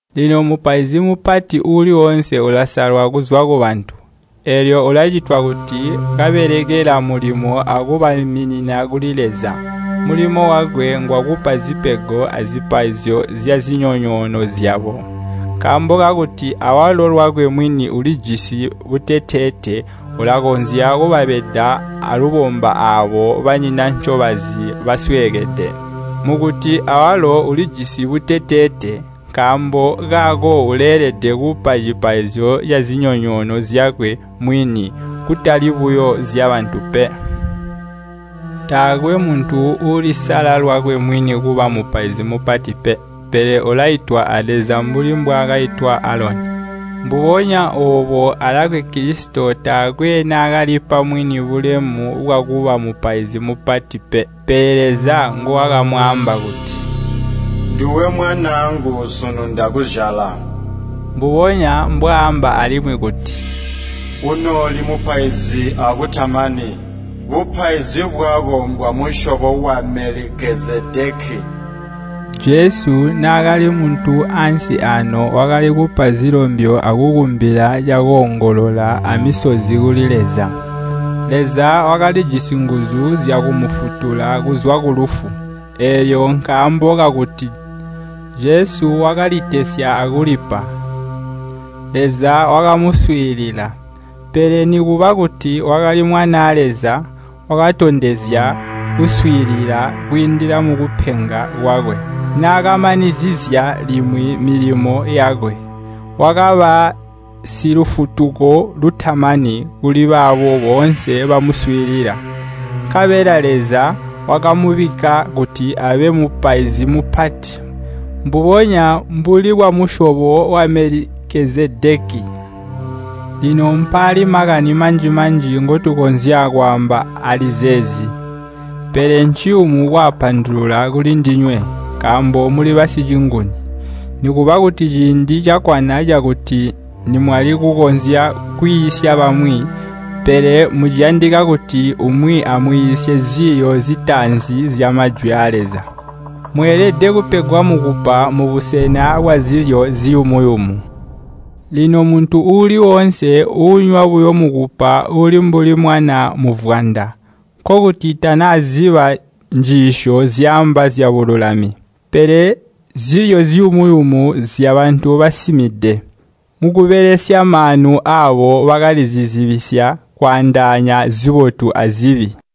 Lino mupaizi mupati uuli woonse ulasalwa kuzwa kubantu, eelyo ulacitwa kuti kababelekela mulimo akubaiminina kuli Leza. Mulimo wakwe ngwakupa zipego azipaizyo zyazinyonyoono zyabo. Nkaambo kakuti awalo lwakwe mwini ulijisi buteteete, ulakonzya kubabeda aalubomba aabo banyina ncobazi basweekede. Mukuti awalo ulijisi buteteete, nkaambo kaako uleelede kupa cipaizyo cazinyonyoono zyakwe mwini, kutali buyo zyabantu pe. Taakwe muntu uulisala lwakwe mwini kuba mupaizi mupati pe. Pele ulaitwa a Leza mbuli bwakaitwa Aloni. Mbubonya oobo alakwe Kilisito taakwe naakalipa mwini bulemu bwakuba Mupaizi Mupati pe. Pele Leza nguwakamwaamba kuti, “Nduwe mwanaangu, sunu ndakuzyala.” Mbubonya mbwaamba alimwi kuti, “Unooli Mupaizi akutamani. Bupaizi bwako mbwamusyobo wa Melikezedeki.” Jesu naakali muntu ansi aano wakali kupa zilombyo akukumbila cakoongolola amisozi kuli Leza. Leza wakalijisi nguzu zyakumufutula kuzwa kulufu, eelyo nkaambo kakuti Jesu wakalitesya akulipa, Leza wakamuswiilila. Pele nikuba kuti wakali Mwanaa Leza, wakatondezya kuswiilila kwiindila mukupenga kwakwe. Naakamanizizya limwi milimo yakwe, wakaba Silufutuko lutamani kuli baabo boonse bamuswiilila. Nkabela Leza wakamubikka kuti abe Mupaizi Mupati, mbubonya mbuuli bwamusyobo wa Melikezedeki. Lino mpaali makani manji-manji ngotukonzya kwaamba ali zeezi, pele nciyumu kwaapandulula kulindinywe, nkaambo muli basicinguni. Nikuba kuti ciindi cakkwana cakuti nimwali kukonzya kwiisya bamwi, pele muciyandika kuti umwi amwiisye ziiyo zitaanzi zya Majwi aa Leza. Mweelede kupegwa mukupa mubusena bwazilyo ziyumu-yumu. Lino muntu uuli woonse uunywa buyo mukupa uli mbuli mwana muvwanda, nkokuti tanaziba njiisyo zyaamba zyabululami. Pele zilyo ziyumu-yumu nzyabantu basimide. Mukubelesya maanu aabo bakalizibizya kwaandaanya zibotu azibi.